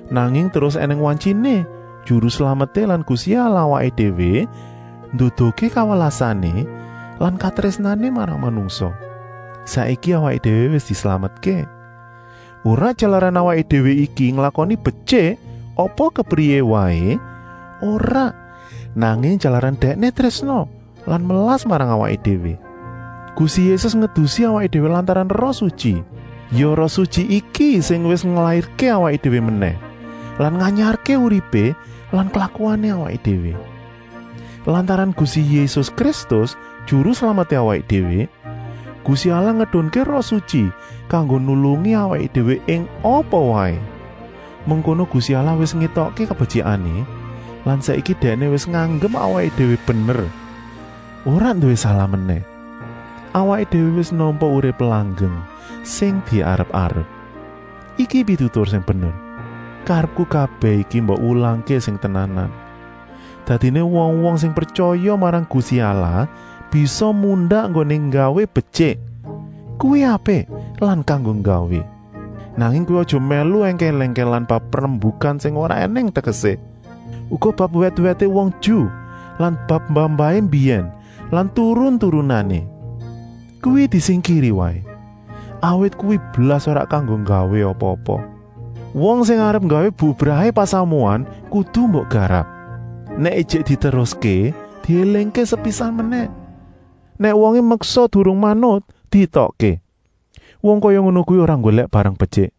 Nanging terus ènèng wantyiné Juru Slameté lan Gusti Allahé awaké déwé nduduhké kawelasané lan katrésnané marang manungsa. Saiki awaké déwé wis dislametké. Ora jalaran awaké déwé iki nglakoni betyik apa kepriyé waé, ora, nanging jalaran Dèkné trésna lan melas marang awaké déwé. Gusti Yésus ngedusi awaké déwé lantaran Roh Sutyi. Ya Roh Sutyi iki sing wis nglairké awaké déwé menèh lan nganyarké uripé lan klakuané awaké déwé. Lantaran Gusti Yésus Kristus, Juru Slameté awaké déwé, Gusti Allah ngedunké Roh Sutyi kanggo nulungi awaké déwé ing apa waé. Mengkono Gusti Allah wis ngétokké kabetyikané lan saiki Dèkné wis nganggep awaké déwé bener, ora nduwé salah menèh. Awaké déwé wis nampa urip langgeng sing diarep-arep. Iki pitutur sing bener. Karepku kabèh iki mbok wulangké sing tenanan. Dadiné wong-wong sing pretyaya marang Gusti Allah bisa mundak enggoné nggawé betyik. Kuwi apik lan kanggo gawé. Nanging kowé aja mèlu èngkèl-èngkèlan bab rembukan sing ora ènèng tegesé. Uga bab wèt-wèté wong Ju lan bab mbah-mbahané mbiyèn lan turun-turunané. Kuwi disingkiri waé, awit kuwi blas ora kanggo gawé apa-apa. Wong sing arep nggawé bubrahé pasamuan kudu mbok garap. Nèk ijik diteruské, diélingké sepisan menèh. Nèk wongé meksa durung manut, dietokké. Wong kaya ngono kuwi ora nggolèk barang betyik,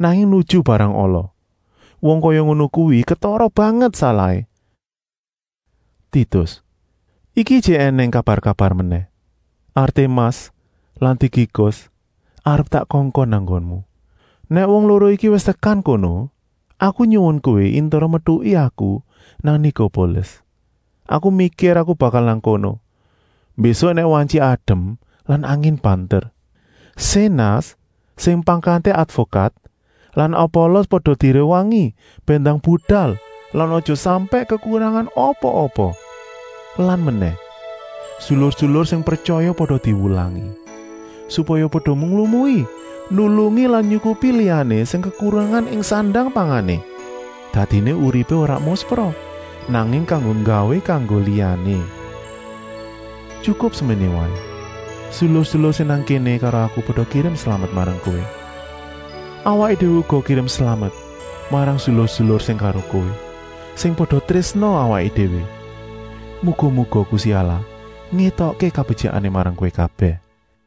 nanging nuju barang ala. Wong kaya ngono kuwi ketara banget salahé. Titus, iki ijik ènèng kabar-kabar menèh. Artemas lan Tikikus arep tak kongkon nang nggonmu. Nèk wong loro iki wis tekan kono, aku nyuwun kowé intera metuki aku nang Nikopolis. Aku mikir aku bakal nang kono, mbésuk nèk wantyi adem lan angin banter. Sénas, sing pangkaté advokat lan Apolos pada diréwangi bèn ndang budal lan aja sampèk kekurangan apa-apa. Lan menèh, sedulur-sedulur sing pretyaya pada diwulangi, supaya pada nglumui nulungi lan nyukupi liyané sing kekurangan ing sandang-pangané. Dadiné uripé ora muspra, nanging kanggo gawé kanggo liyané. Tyukup seméné waé, sedulur-sedulur sing nang kéné karo aku pada kirim slamet marang kowé. Awaké déwé uga kirim slamet marang sedulur-sedulur sing karo kowé, sing pada trésna awaké déwé. Muga-muga Gusti Allah ngétokké kabetyikané marang kowé kabèh. Paulus